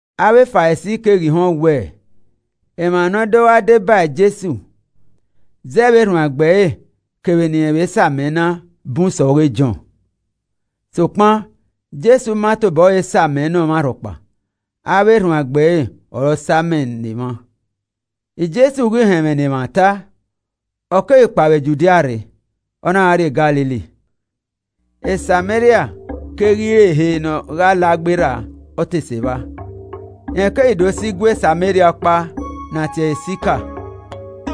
Avbe Farisi keghi họn wẹẹ, emwa ne ọ do gha deba Jesu zẹ vbe erhuanegbe ẹre kevbe ne irẹn vbe sa amẹ na bun sẹ ọghe Jọn. (Sokpan, Jesu ma tobọ ẹre sa amẹ ne ọmwa rhọkpa avbe erhuanegbe ẹre ọre ọ sa amẹ ne emwa.) Jesu ghi họn ẹmwẹ ne emwa ta, ọ keghi kpao vbe Judia rre, ọ na gha rrie Galili. Sameria keghi re ehe ne ọ gha la gberra ọ te sẹ evba. Rẹn keghi do sẹ igue Sameria ọkpa ne a tie ẹre Sika,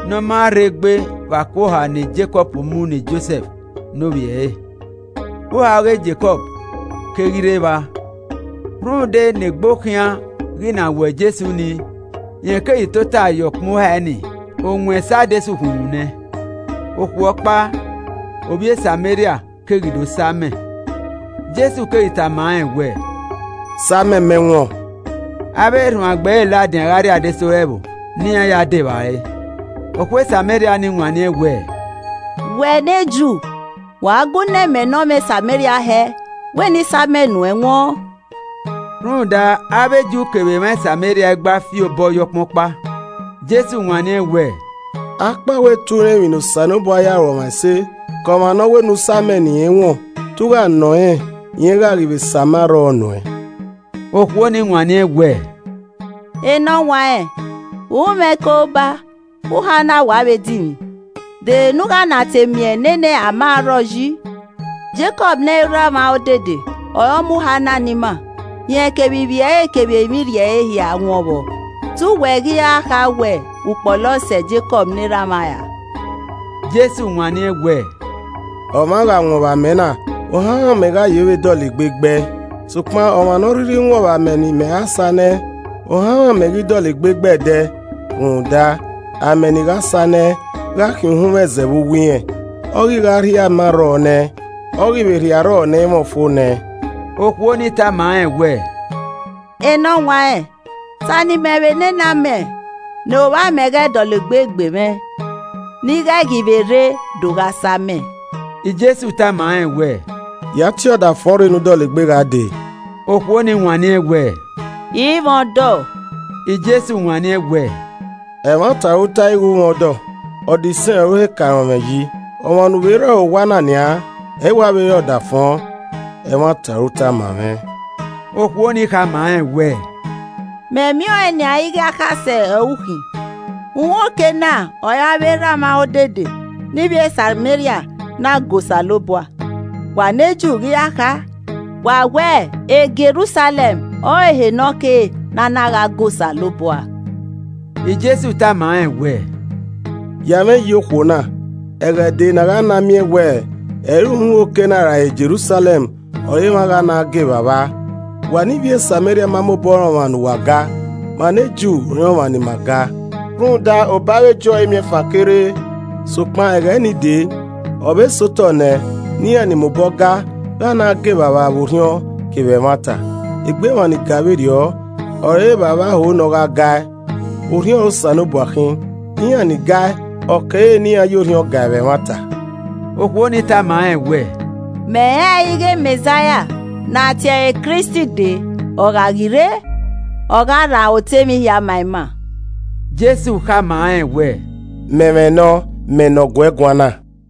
ne ọ ma rrei gbe vbe ako oha ne Jekọb mu ne Josẹf ne ovbi ẹre. Uhae ọghe Jekọb keghi rre evba, rhunmwuda ne egbe okhian ghi na wọ Jesu ni, rẹn keghi tota ye ọkpẹn uhae ni, owẹn sẹ adesẹ ukhunmwu nẹ. Okhuo ọkpa, ovbi e Sameria keghi do sa amẹ, Jesu keghi tama rẹn wẹẹ, “Sa amẹ mẹ wọn.” ( Avbe erhuanegbe ẹre ladian gha rrie adesẹ ore ẹvbo ne iran ya dẹ evbare.) Okhuo Sameria nii wanniẹn wẹẹ, “Wẹ ne Ju, vbe u a gu nọ imẹ ne ọmwa Sameria hẹ wẹ ne I sa amẹ nuẹn wọn.” (Rhunmwuda avbe Ju kevbe emwa Sameria i gba fi obọ ye ọkpan ọkpa.) Jesu wanniẹn wẹẹ, “Akpawẹ te u rẹn emwi ne Osanobua ya ru ọmwa ẹse ke ọmwa ne ọ wẹ ne u sa amẹ ne irẹn wọn, te u gha nọ rẹn, rẹn gha ghi vbe sa amẹ arrọọ nuẹn.” Okhuo nii wanniẹn wẹẹ, “Enọwanrẹn, u i mwẹ ikoroba, uhae na wa vbe dinmwi. De ehe ne a gha na te miẹn nene amẹ arrọọ yi? Jekọb ne erha mwa odede ọre ọ mu uhae na ne ima, rẹn kevbe ivbi ẹre kevbe emwi irri ẹre hia wọn vbọ. Te uwẹ ghi wẹ, u kpọlọ sẹ Jekọb ne erha mwa ra?” Jesu wanniẹn wẹẹ, “Ọmwa gha wọn vbe amẹ na, ohanmwẹ amẹ gha ye vbe dọlegbe gbe ẹe. Sokpan ọmwa ne ọ rhirhi wọn vbe amẹ ne imẹ gha sa nẹẹn ohanmwẹ amẹ i ghi dọlegbe gbe ẹe ẹdẹ. Rhunmwuda amẹ ne I gha sa nẹẹn gha khian uhunmwu ẹzẹ vbe uwu irẹn, ọ ghi gha rhie amẹ arrọọ nẹẹn, ọ ghi vbe rhie arrọọ ne ẹ i mwẹ ọfo nẹẹn.” Okhuo nii tama rẹn wẹẹ, “Enọwanrẹn, sa ne imẹ vbe nene amẹ ne ovbamẹ ghẹ ghi dọlegbe gbe mwẹ, ne I ghẹ ghi vbe rre do gha sa amẹ.” Jesu tama rẹn wẹẹ, “Ya tie ọdafọn rre, ne u dọlegbe gha dee.” Okhuo ni wanniẹn wẹẹ, “I mwẹ ọdọ.” Jesu wanniẹn wẹẹ, “Ẹmwata ọre u tae ighe u i mwẹ ọdọ. Ọdọ isẹn ọre u he ka rọnmwẹ yi, ọmwa ne u vbe rre ọre owa na nian, ẹ i wa vbe rre ọdafọn. Ẹmwata ọre u ta ma mwẹ.” Okhuo ni khama rẹn wẹẹ, “Mẹ miẹn ọẹn nian ighe akhasẹ ọre u khin. Uhunmwu oke na ọre avbe erha mwa odede ne ivbi Sameria na ga Osanobua. Wa ne Ju ghi ra kha, wa wẹ, Jerusalẹm ọrọre ehe ne ọ kere ne a na gha ga Osanobua.” Jesu tama rẹn wẹẹ, “Ya ẹmwẹ mwẹ yi okhuo na, ẹghẹ dee ne a gha na miẹn wẹ ẹ i re uhunmwu oke na ra Jerusalẹm ọre emwa gha na ga Evbavba. Wa ne ivbi e Sameria ma mobọ rẹn ọmwa ne uwa ga. Ma ne Ju rẹn ọmwa ne ima ga rhunmwuda obọ avbe Ju ọre imiẹnfan ke rre. Sokpan ẹghẹ nii dee, ọ vbe sẹ otọ nẹ ne iran ni mobọ ga, gha na ga Evbavba vbe orhiọn kevbe ẹmwata. Egbe emwa nii ga vberriọ ọre Evbavba ho ne ọ gha gae. Orhiọn ọre Osanobua khin, iran ni gae, ọ kere ne iran ya orhiọn gae vbe ẹmwata.” Okhuo ni tama rẹn wẹẹ, “Mẹ rẹnrẹn ighe Mẹzaia ne a tie ẹre Kristi dee. Ọ gha ghi rre, ọ gha rhan otọ emwi hia ma ima.” Jesu khama rẹn wẹẹ, “Mẹ mwẹ nọ, mẹ ne ọ gu ẹ guan na.”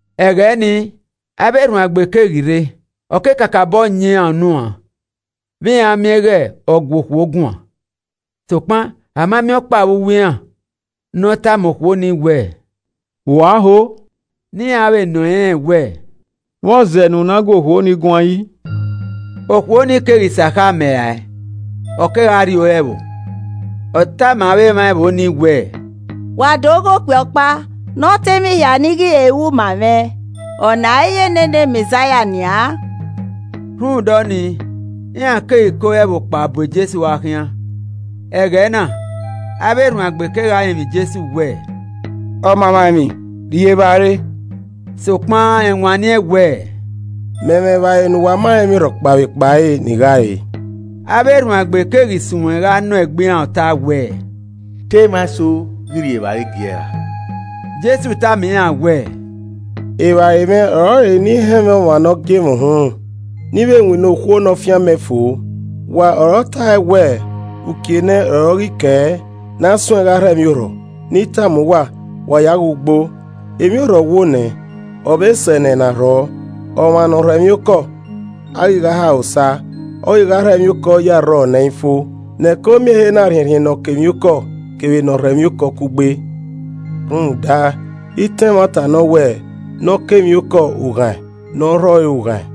Ẹghẹ ni, avbe erhuanegbe keghi rre, ọ ke kakabọ yan iran unu uan vbe iran miẹn ighe ọ gu okhuo guan. Sokpan a ma miẹn ọkpa vbe uwu iran ne ọ tama okhuo ni wẹ, “Vbe u a họ?” Ra ne iran vbe nọ irẹn wẹẹ, “Vbọzẹ ne u na gu okhuo nii guan yi?” Okhuo ni keghi sẹ akhe amẹ rae, ọ kegha rrie ore ẹvbo. Ọ tama avbe emwa ẹvbo nii wẹẹ, “Wa do ghe okpia ọkpa ne ọ ta emwi hia ne i ghi he ru ma mwẹ, ọna i re nene Mẹzaia nian?” Rhunmwuda ọnii, iran keghi ke ore ẹvbo kpao bu Jesu gha khian. Ẹghẹ na, avbe erhuanegbe kegha rinmwian Jesu wẹẹ, “Ọmamwaemwi, rri evbare.” Sokpan rẹn wanniẹn wẹẹ, “Mẹ mwẹ evbare ne uwa ma rẹn emwi rhọkpa vbe ekpa ẹre, ne I gha re.” Avbe erhuanegbe keghi suẹn gha nọ egbe iran ọta wẹẹ, “Te emwa eso ghi rhie evbare giee ra?” Jesu tama iran wẹẹ, “Evbare mwẹ ọrọre ne I họn ẹmwẹ ọmwa ne ọ gie mwẹ uhunmwu, ne I vbe winna okhuo ne ọ fian mẹ fo. Wa ọre ọ ta ẹe wẹẹ, ‘Uki enẹ ọre ọ ghi kẹ ne a suẹn gha rhọ emwi orhọ.’ Ne I tama uwa. Wa ya ghe ugbo, emwi orhọ wo nẹ, ọ vbe sẹ nẹ ne a rhọ. Ọmwa ne ọ rhọ emwiokọ, a ghi gha ha ẹre osa, ọ ghi gha rhọ emwiorhọ ye arrọọ ne ẹ i fo, ne ẹko miẹn ehe na rhiẹnrhiẹn ne ọ kọ emwiokọ kevbe ne ọ rhọ emwiokọ kugbe. Rhunmwuda, itan ẹmwata nọ wẹ, ‘Ne ọ kọ emwiokọ, u ghaẹn, ne ọ rhọ ọre ughaẹn.’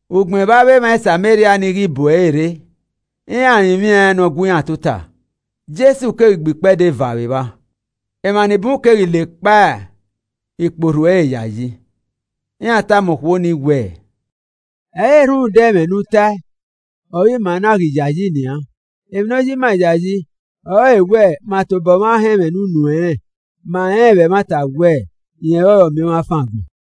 Ugbẹn vbe avbe emwa Sameria ni ghi bu ẹre rre, iran rinmwian ne ọ gu iran tota, Jesu keghi gbe ikpẹdẹ eva vbe evba. Emwa ni bun keghi la ekpa ikpe orhu ẹre yayi. Iran tama okhuo nii wẹẹ, “Ẹ i re rhunmwuda ẹmwẹ ne u tae ọre ima na ghi yayi nian, emwi ne ọ ya ima yayi ọrọre wẹ ma tobọ mwa họn ẹmwẹ ne unu ẹnrẹn, ma rẹnrẹn vbe ẹmwata wẹ, rẹn ọrọre Ọmiọnmwafan agbọn.”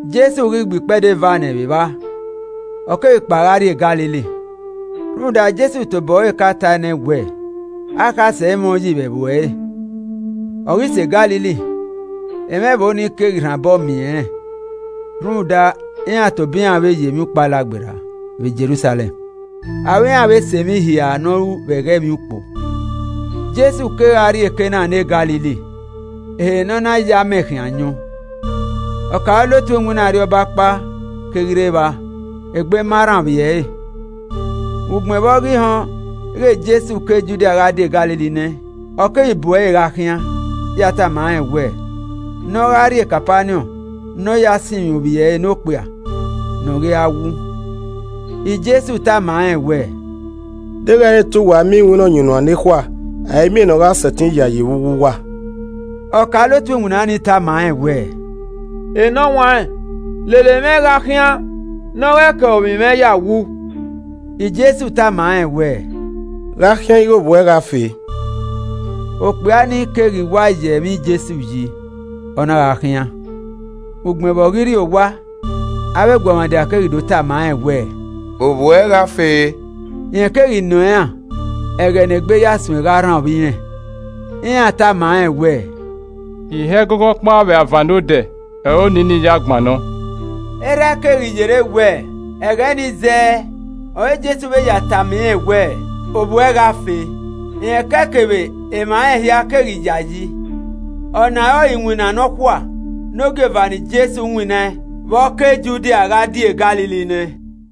Jesu ghi gbe ikpẹdẹ eva nẹ vbe evba, ọ keghi kpao gha rrie Galili. Rhunmwuda Jesu tobọ ẹre ka tae nẹ wẹẹ, “Akhasẹ i mwẹ uyi vbe ẹvbo ẹre.” Ọ ghi sẹ Galili, emwa ẹvbo nii keghi rhan obọ miẹn rẹn rhunmwuda iran tobọ iran vbe yo Emwiukpo Alagberra vbe Jerusalẹm, aro iran vbe sẹ emwi hia ne ọ ru vbe ẹghẹ Emwiukpo. Jesu kegha rrie Kana ne Galili, ehe ne ọ na ya amẹ khian ayọn. Ọkaolotu iwinna arriọba ọkpa keghi rre evba, egbe ma rran ovbi ẹre. Ugbẹn vbe ọ ghi họn ighẹ Jesu ke Judia gha die Galili nẹ, ọ keghi bu ẹre gha khian ya tama rẹn wẹ ne ọ gha rrie Kapaniọn ne ọ ya sinmwi ovbi ẹre ne okpia ne ọ ghi ra wu. Jesu tama rẹn wẹ, “Deghẹ ẹ i re te uwa miẹn iwinna ọyunnuan nekhua, a i miẹn ne ọ gha sẹtin yayi vbe uwu uwa.” Ọkaolotu iwinna ni tama rẹn wẹẹ, “Enọwanrẹn lele mwẹ gha khian ne ọ ghẹ kẹe ovbi mwẹ ya wu.” Jesu tama rẹn wẹẹ, “Gha khian ighẹ ovbi uẹ gha fe.” Okpia ni keghi wa ya ẹmwẹ Jesu yi, ọ na gha khian. Ugbẹn vbe ọ ghi rrie owa, avbe eguọmwadia keghi do tama rẹn wẹẹ, “Ovbi uẹ gha fe.” Rẹn keghi nọ iran ẹghẹ ne egbe ya suẹn gha rran ovbi irẹn. Iran tama rẹn wẹ, “Ihe ẹgogo ọkpa vbe avan nodẹ ọre oni nii ya gbannọ.” Erha ẹe keghi yerre wẹ, ẹghẹ nii zẹẹ ọre Jesu vbe ya tama irẹn wẹẹ, “Ovbi uẹ gha fe.” Rẹn ke ẹe kevbe emwa rẹn hia keghi yayi. Ọna ọrọre iwinna nọkhua ne ogieva ne Jesu winnaẹn vbe ọ ke Judia gha die Galili nẹ.